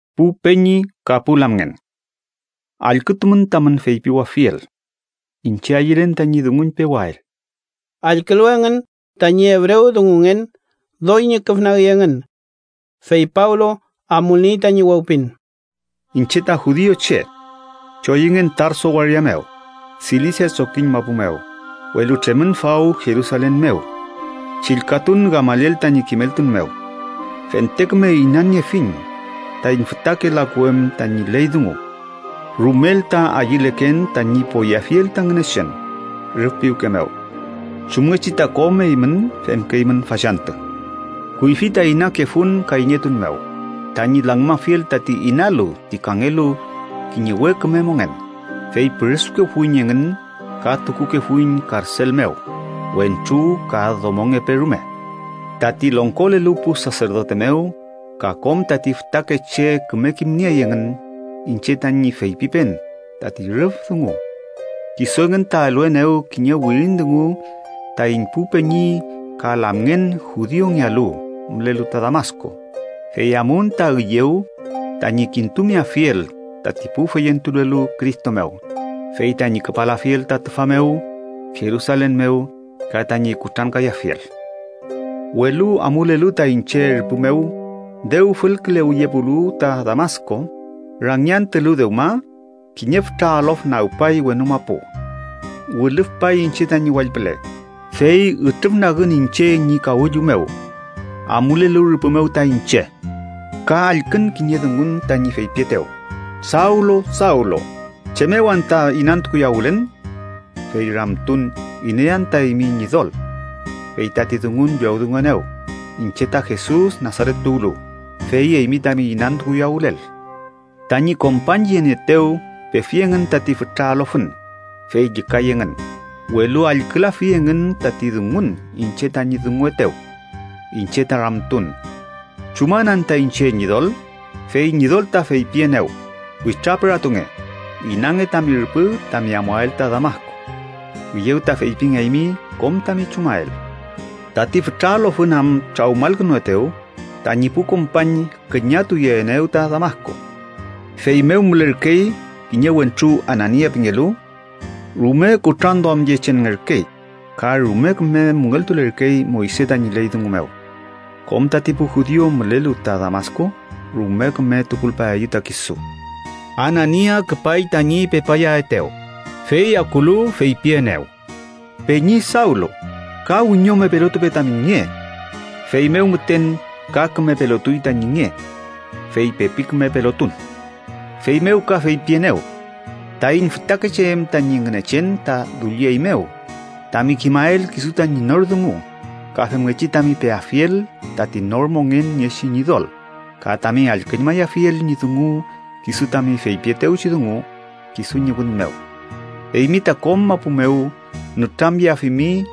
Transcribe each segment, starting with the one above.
“Pu peñi ka pu lamngen, allkütumün tamün feypiwafiel. Iñche ayülen tañi dunguñpewael.” Allkülu engün tañi ebrewdungungen, doy ñüküfnagi engün. Fey Pablo amulniey tañi wewpin: “Iñche ta judiuche. Choyüngen Tarso waria mew, Silisia trokiñ mapu mew, welu tremün faw Jerusalen mew. Chillkatun Gamaliel tañi kimeltun mew. Fente küme inaniefiñ taiñ fütake laku em tañi ley dungu. Rumel ta ayüleken tañi poyeafiel ta Ngünechen rüf piwke mew, chumngechi ta kom eymün femkeymün fachantü. Kuyfi ta inakefun kayñetun mew tañi langümafiel tati inalu ti kangelu kiñe we küme mongen, fey püresukefuiñ engün ka tukukefuiñ karsel mew, wentru ka domongepe rume. Tati longkolelu pu saserdote mew ka kom tati fütakeche küme kimniey engün iñche tañi feypipen tati rüf dungu. Kisu engün ta eluenew kiñe wirin dungu taiñ pu peñi ka lamngen judiungealu mülelu ta Damasku, fey amun ta üyew tañi kintumeafiel tati pu feyentulelu Cristo mew, fey tañi küpalafiel ta tüfa mew Jerusalen mew ka tañi kutrankayafiel. “Welu amulelu ta iñche rüpü mew, dew fülkülewiyepulu ta Damasku, rangi antülu dewma, kiñe fütra alof nagpay wenu mapu. Wilüfpay iñche tañi wall püle, fey ütrüfnagün ta rüpü mew. Ka allkün kiñe dungun tañi feypietew: ‘Sawlu, Sawlu, ¿chem mew anta inantukuyawülen?’ Fey ramtun: ‘¿Iney anta eymi, Ñidol?’ Fey tati dungun llowdunguenew: ‘Iñche ta Jesus Nasaret tuwlu, fey eymi tami inantukuyawülel.’ Tañi kompañyenieetew pefi engün tati fütra alofün, fey llükay engün, welu allkülafi engün tati dungun iñche tañi dunguetew. Iñche ta ramtun: ‘¿Chuman anta iñche, Ñidol?’ Fey Ñidol ta feypienew: ‘Witrapüratunge. Inange tami rüpü tami amuael ta Damasku. Üyew ta feypingeaymi kom tami chumael.’ Tati fütra alofün am trawmalkünuetew, tañi pu kompañ küñatuyeenew ta Damasku. “Fey mew mülerkey kiñe wentru Anania pingelu. Rume kutranduamyechenngerkey ka rume küme müngeltulerkey Moyse tañi ley dungu mew. Kom tati pu judiu mülelu ta Damasku rume küme tukulpaeyew ta kisu. Anania küpay tañi pepayaetew, fey akulu, feypienew: ‘Peñi Sawlu, ka wiñome pelotupe tami nge.’ Feymew müten ka küme pelotuy tañi nge, fey pepi küme pelotun. Feymew ka feypienew: ‘Taiñ fütakeche em tañi Ngünechen ta dullieymew tami kimael kisu tañi nor dungu ka femngechi tami peafiel tati nor mongen niechi Ñidol ka tami allküñmayafiel ñi dungu kisu tami feypietewchi dungu kisu ñi wün mew. Eymi ta kom mapu mew nütramyeafimi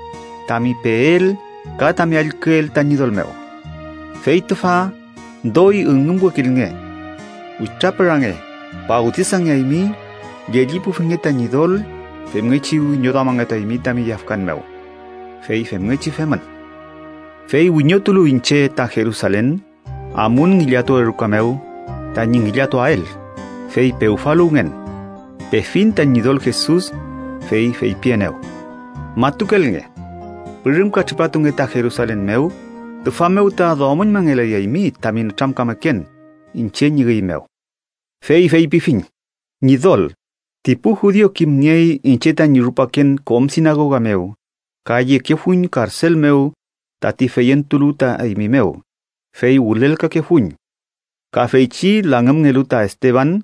tami peel ka tami allküel ta Ñidol mew. Fey tüfa, doy üngümwekilnge. Witrapürange, fawtisangeaymi, llellipufinge ta Ñidol femngechi wiñoduamangetuaymi tami yafkan mew.’ Fey femngechi femün. “Fey wiñotulu iñche ta Jerusalen, amun ngillatuwe ruka mew tañi ngillatuael, fey pewfaluwngen. Pefiñ ta Ñidol Jesus, fey feypienew: ‘Matukelnge. Pürümka tripatunge ta Jerusalen mew, tüfa mew ta duamüñmangelayaymi tami nütramkameken iñche ñi üy mew.’ Fey feypifiñ: ‘Ñidol, ti pu judiu kimniey iñche tañi rupaken kom sinagoga mew ka yekefuiñ karsel mew tati feyentulu ta eymi mew, fey wülelkakefuiñ. Ka feychi langümngelu ta Esteban,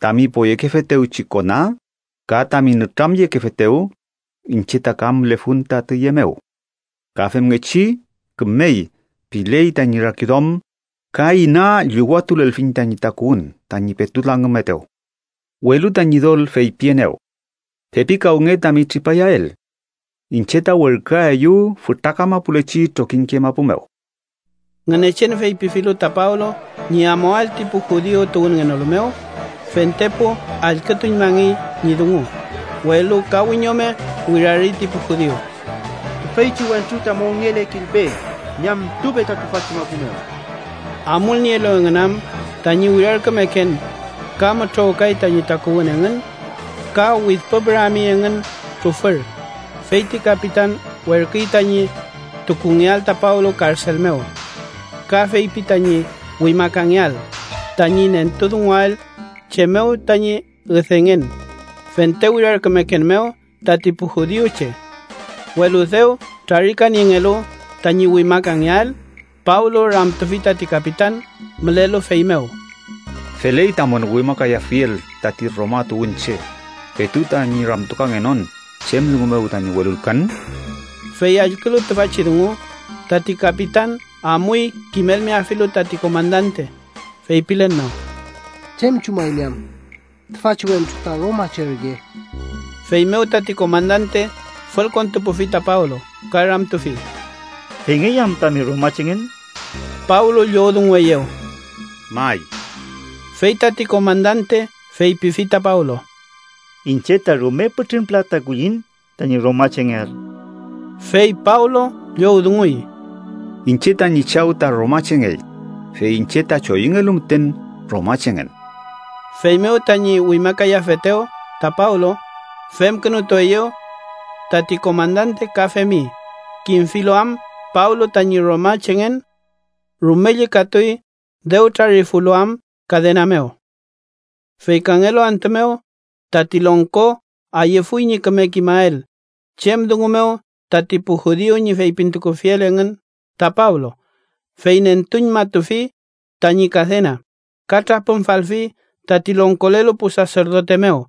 tami poyekefetewchi kona, ka tami nütramyekefetew, iñche ta ka mülefun ta tüye mew. Ka femngechi “kümey” piley tañi rakiduam, ka ina llüwatulelfiñ tañi takuwün tañi petu langümetew.’ Welu ta Ñidol feypienew: ‘Pepikawnge tami tripayael. Iñche ta werküaeyu fütra kamapulechi trokiñke mapu mew.’” Ngünechen feypifilu ta Pablo ñi amuael ti pu judiu tuwünngenolu mew, fentepu allkütuñmangey ñi dungu, welu ka wiñome wirari ti pu judiu: “¡Tüfeychi wentru ta mongelekilpe! ¡Ñamtupe ta tüfachi mapu mew!” Amulnielu engün am tañi wirarkümeken ka mütrowkay tañi takuwün engün ka widpüpürami engün trufür, fey ti kapitan werküy tañi tukungeael ta Pablo karsel mew. Ka feypi tañi wimakangeael, tañi nentudunguael chem mew tañi üdengen fente wirarkümeken mew tati pu judiuche. Welu dew trarikaniengelu tañi wimakangeael, Pablo ramtufi tati kapitan mülelu fey mew: —¿Feley tamün wimakayafiel tati Roma tuwünche, petu tañi ramtukangenon chem dungu mew tañi welulkan? Fey allkülu tüfachi dungu, tati kapitan amuy kimelmeafilu tati komandante, feypilen mew: —¿Chem chumaymi am? Tüfachi wentru ta romache ürke. Feymew tati komandante fülkontupufi ta Pablo, ka ramtufi: —¿Feyngey am tami romachengen? Pablo llowdungueyew: —May. Fey tati komandante feypifi ta Pablo: —Iñche ta rume pütrün pülata kullin tañi romachengeael. Fey Pablo llowdunguy: —Iñche tañi chaw ta romachengey, fey iñche ta choyüngelu müten romachengen. Feymew tañi wimakayafetew ta Pablo femkünutueyew. Tati komandante ka femi, kimfilu am Pablo tañi romachengen. Rume llükatuy dew trarifulu am kadena mew. Fey kangelu antü mew, tati longko ayüfuy ñi küme kimael chem dungu mew tati pu judiu ñi feypintukufiel engün ta Pablo, fey nentuñmatufi tañi kadena ka trapümfalfi tati longkolelu pu saserdote mew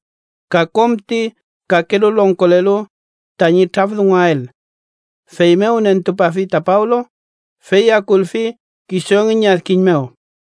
ka kom ti kakelu longkolelu tañi traf dunguael. Feymew nentupafi ta Pablo, fey akulfi kisu engün ñi adkiñ mew.